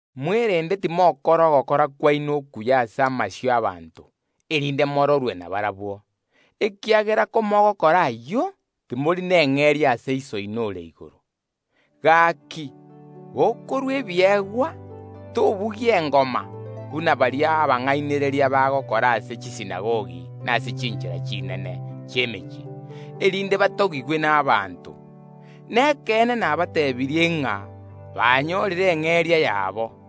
Mwerende timokora ogokora kwaino okuya ase amasio y’abanto, erinde mororwe nabarabwo, ekiagera komogookora ayio, timori neng’eria ya Iso oino ore igoro. Gaki gokorua ebiegwa, tobugia engoma, buna baria abang’ainereria bagokora ase chisinagogi na ase chinchera chinene chi’emechie, erinde batogigwe n’abanto. Nekeene nabateebirie ng’a barabwo banyorire eng’eria yabo.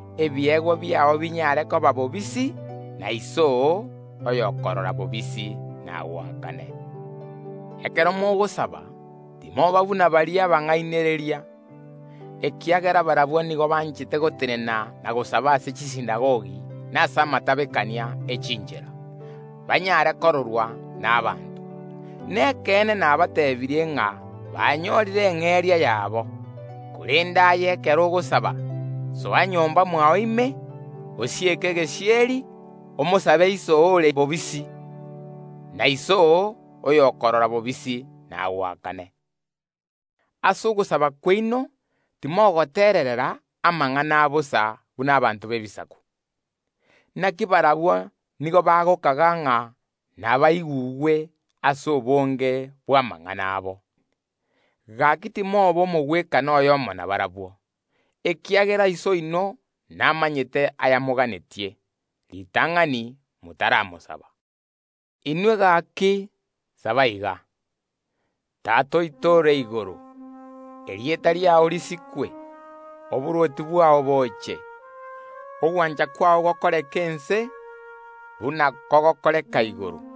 Obokonyi bwao bonyare koba bobisi; na Iso oo oyokorora bobisi nagoakane. Ekero mogosaba, timoba buna baria abang’ainereria; ekiagera barabwo nigo banchete gotenena na gosaba ase chisinagogi na ase amatabekania ye chinchera, banyare kororwa n’abanto. Nekeene nabateebirie ng’a banyorire eng’eria yabo. Korende aye ekero ogosaba, soa nyomba mwao ime, osieke egesieri, omosabe Iso oo ore bobisi; na Iso oo oyokorora bobisi nagoakane. Ase ogosaba kwaino timokwana amang’ana amange abosa buna abanto b’Ebisaku; naki barabwo nigo bagokaga ng’a Nyasae nabaigwe ase obonge bw’amang’ana abo. Gaki timoba omogwekano oyomo nabarabwo, ekiagera Iso oino namanyete aya moganetie, ritang’ani motaramosaba. “Bono inwe nigo mogwenerete gosaba iga: Tata oito ore igoro, Erieta riao risikwe. Oborwoti bwao boche, Ogwancha kwao gokoreke ense, Buna kogokoreka igoro.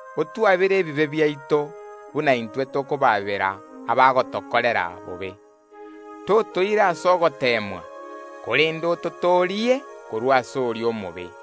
Otwabere ebibe biaito, Buna intwe tokobaabera abagotokorera bobe. Totoira ase ogoteemwa, Korende ototoorie korwa ase oria omobe.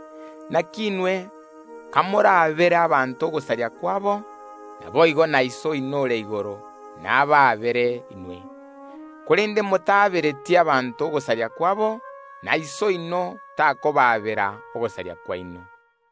Inaki inwe kamoraabere abanto ogosaria kwabo, naboigo na Iso oino ore igoro nabaabere inwe. Korende motaabereti abanto okomocha kwabo, na Iso oino takobaabera okomocha kwaino.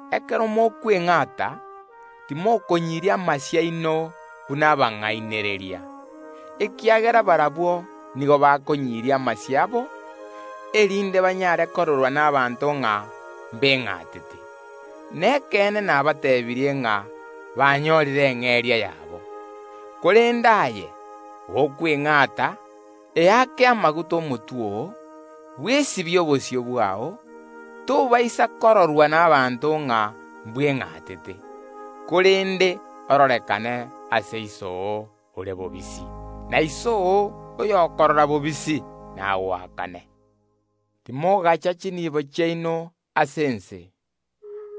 “Ekero mokweng’ata timokonyiria amasio aino buna abang’ainereria, ekiagera barabwo nigo bakonyiria amasio abo, erinde banyare kororwa n’abanto ng’a mbeng’atete. Nekeene nabateebirie ng’a banyorire eng’eria yabo. Korende aye, gokweng’ata, eake amaguta omotwe oo, bwesibie obosio bwao, erio tobaisa kororwa n’abanto ng’a mbweng’atete, korende ororekane ase Iso oo ore bobisi, na Iso oo oyokorora bobisi nagoakane. “Timogacha chinibo chiaino ase ense,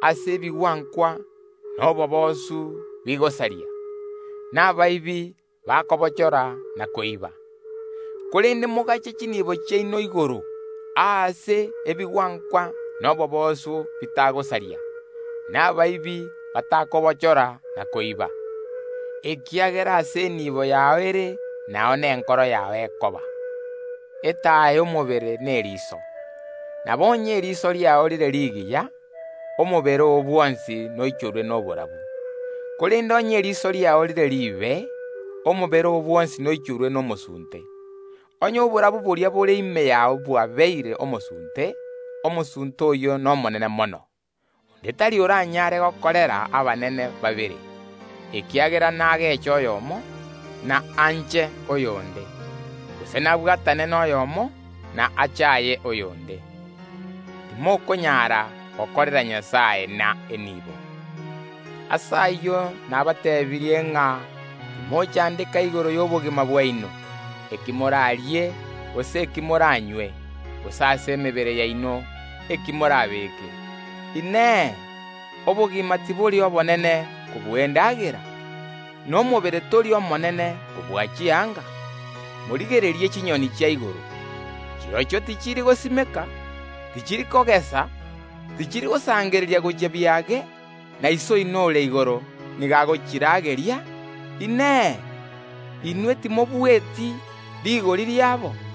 aase ebigwankwa na oboboosu bigosaria, na abaibi bagotaagora na koiba; korende mogache chinibo chiaino igoro, aase ebigwankwa na oboboosu bitagosoa, na abaibi batagotaagora na koiba. Ekiagera aase enibo yao ere, nao nenkoro yao ekoba. “Etaya y’omobere n’eriiso. Nabo onye eriiso riao rire rigiya, omobere oo bwonsi noichorwe noborabu; korende onye eriiso riao rire riibe, omobere oo bwonsi noichorwe nomosunte. Onye oborabu boria bore ime yao bwabeire omosunte, omosunte oyio nomonene mono. “Onde tari oranyare gokorera abanene babere, ekiagera nageche oyomo, na anche oyonde, gose nabwatane noyomo, na achaaye oyonde. Timokonyara gokorera Nyasae na enibo. “Ase ayio nabateebirie ng’a timochandeka igoro y’obogima bwaino, eki morarie, gose eki moranywe, gose ase emebere yaino, eki morabeeke. Inee! Obogima tibori obonene kobua endagera? Na omobere tori omonene kobua chianga? Morigererie chinyoni chia igoro! Chirochio tichiri gosimeka, tichiri kogesa, tichiri gosangereria gochia biage, na Iso oino ore igoro nigo agochirageria. Inee! Inwe timobueti rigori riabo?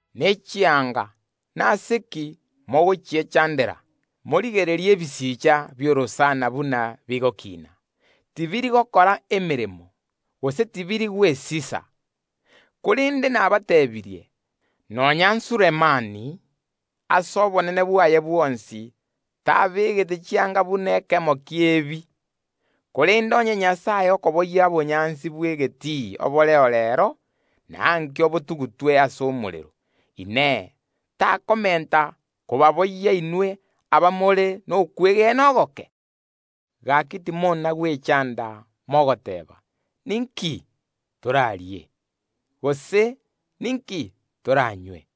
Ne chianga, nase ki mogochiechandera? Morigererie ebisicha bi’orosana buna bigokiina; tibiri gokora emeremo, gose tibiri gwesisa; korende nabateebirie, nonya Sulemani omonyene ase obonene bwaye bwonsi tabegete chianga buna ekemo ki’ebi. Korende onye Nyasae okoboyia obonyansi bw’egetii oboreo reero, na ankio botugutwe ase omorero, Inee, takomenta kobaboyia inwe, abamore nokwegena ogoke? Gaki, timona gwechanda mogoteeba: Ninki torarie? Gose: Ninki toranywe?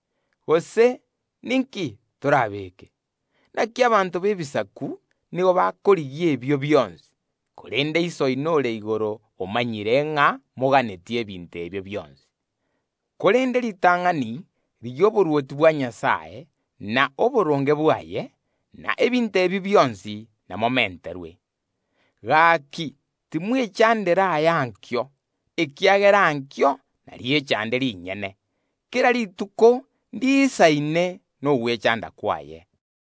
Gose: Ninki torabeeke? Inaki abanto b’Ebisaku nigo bakorigia ebio bionsi; korende Iso oino ore igoro namanyete ng’a ’moganetie ebinto ebio bionsi. Korende ritang’ani rigia oborwoti bwa Nyasae na oboronge bwaye, na ebinto ebio bionsi ’namobiegwe. “Gaki, timwechandera ay’ankio, ekiagera ankio inariechande rinyene. Kera rituko ndiisaine nogwechanda kwaye.